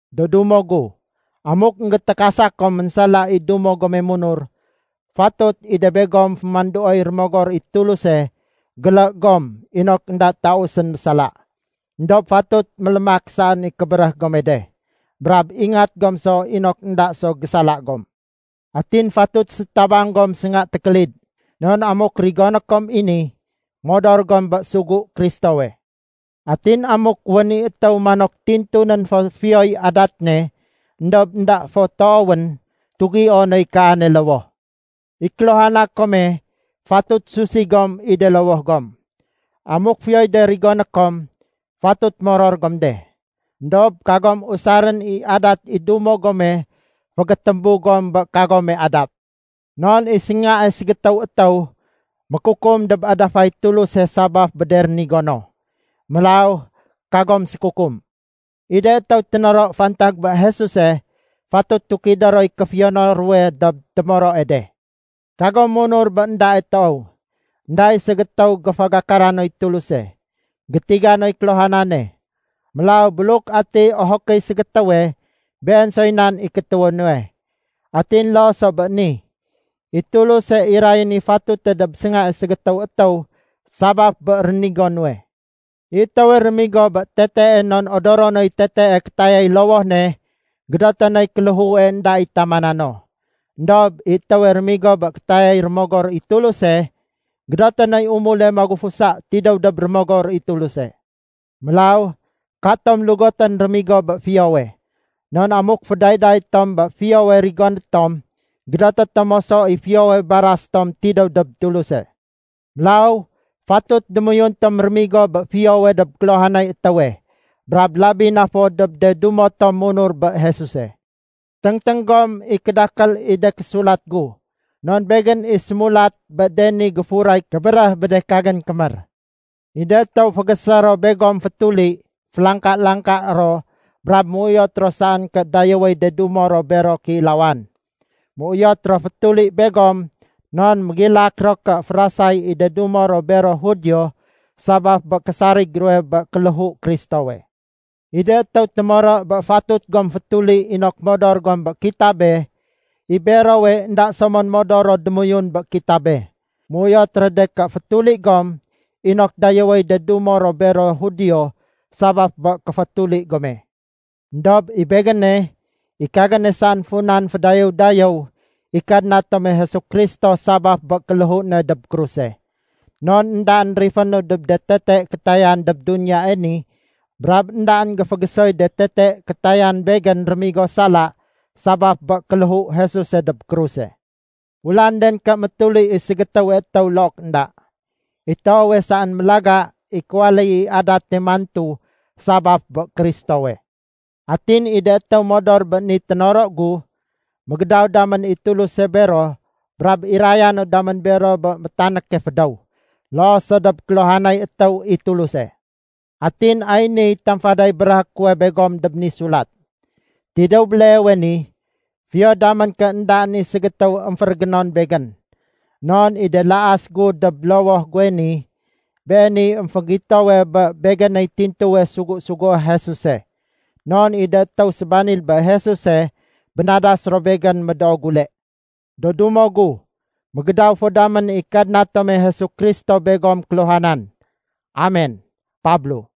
Do dumo gu, amuk énggétékasa kom ménsala i dumo gome munur, fatut i de begom fémanduoy Rémogor i Tuluse gélé gom inok énda tausén mésala. Endob fatut mélémak saén i kébéréh gome de. Brab ingat gom so inok énda so gésala gom. Atin fatut sétabang gom sénga tékélid, non amuk rigoné kom i ni, modor gom bé sugu Kristowe. Atin amuk wén i étéw manok tintunén fo fiyoy adat ne éndob énda fo toowén, tugio noy kaane lowoh. I kéluhana kome fatut susi gom i de lowoh gom. Amuk fiyoy de rigoné kom, fatut moror gom de. Endob kagom usarén i adat i dumo gome fégétémbu gom bé kagome adat. Non i séngae ségétéw étéw mékukum dob adafay Tuluse sabaf bé de rénigo no. Mélaw kagom sékukum. I de étéw ténoro fantag bé Jesuse, fatut tukidé roy kéfiyono ruwe dob témoroe de. Kagom munur bé éndae toow. Enda i ségétéw géfagakara noy Tuluse. Gétiga noy kéluhanane. Mélaw buluk atiy ohokéy ségétéwe, been soy nan i kétéwé nuwe. Atin loo so bé ni, i Tuluse irayén i fatute dob séngae ségétéw étéw sabaf bé rénigo nuwe. I étéwe rémigo bé tetee non odoro noy tetee kétayay lowoh ne, gédoté noy kéléhue énda i tamana no. Endob i étéwe rémigo bé kétayay Rémogor i Tuluse, gédoté noy umule magufusa tidéw dob Rémogor i Tuluse. Mélaw katom lugotén rémigo bé fiyowe. Non amuk fédayday tom bé fiyowe rigoné tom, gédoté tom moso i fiyowe baras tom tidéw dob Tuluse. Mélaw fatut démoyun tom rémigo bé fiyowe dob kéluhanay étéwe, brab labi na fo dob de dumo tom munur bé Jesuse. Téngténg gom i kédakél i de késulat gu, non begén i sémulat bé de ni géfuray kébéréh bé de kagén kémér. I de étéw fégésé ro begom fétuli, félangka-langka ro brab méuyot ro saén ké dayéwéy de dumo ro bero kéilawan. Méuyot ro fétuli begom non mégilak ro ké férasay i de dumo ro bero Judio sabaf bé késarig ruwe bé kéléhu Kristowe. I de étéw témoro bé fatut gom fétuli inok modor gom bé kitabe, i berowe énda so mon modor ro démoyun bé kitabe. Méuyot ro de ké fétuli gom inok dayéwéy de dumo ro bero Judio sabaf bé kéfétuli gome. Endob i begéne, i kagéne saén funan fédayéw-dayéw i Kadna tome Jesu Kristo sabaf bé kéléhu ne dob kruse. Non éndaén rifénu dob de tete kétayan dob duniyae ni brab éndaén géfégésoy de tete kétayan begén rémigo sala, sabaf bé kéléhu Jesuse dob kruse. Ulanden ké métuli i ségétéwe étéw, look énda. I toowe saén mélaga i kéwaléy i adate mantu sabaf bé Kristowe. Atin i de étéw modor bé ni ténoro gu, mégédaw damén i Tuluse bero brab iraya no damén bero bé métanéke fédéw, loo so dob kéluhanay étéw i Tuluse. Atin ay niy tamfaday béréhé kuwe begom dob ni sulat. Tidéw béleewe ni, fiyo damén ké éndaén i ségétéw émférégénon begén. Non i de laas gu dob lowoh guwe ni, beeniy émfégitowe bé begéney tintuwe sugu-sugué Jesuse. Non i de étéw sébanil bé Jesuse bénadas ro begén médoo gule. Do dumo gu, mégédaw fo damén i Kadna tome Jesu Kristo begom kéluhanan. Amen. Pablo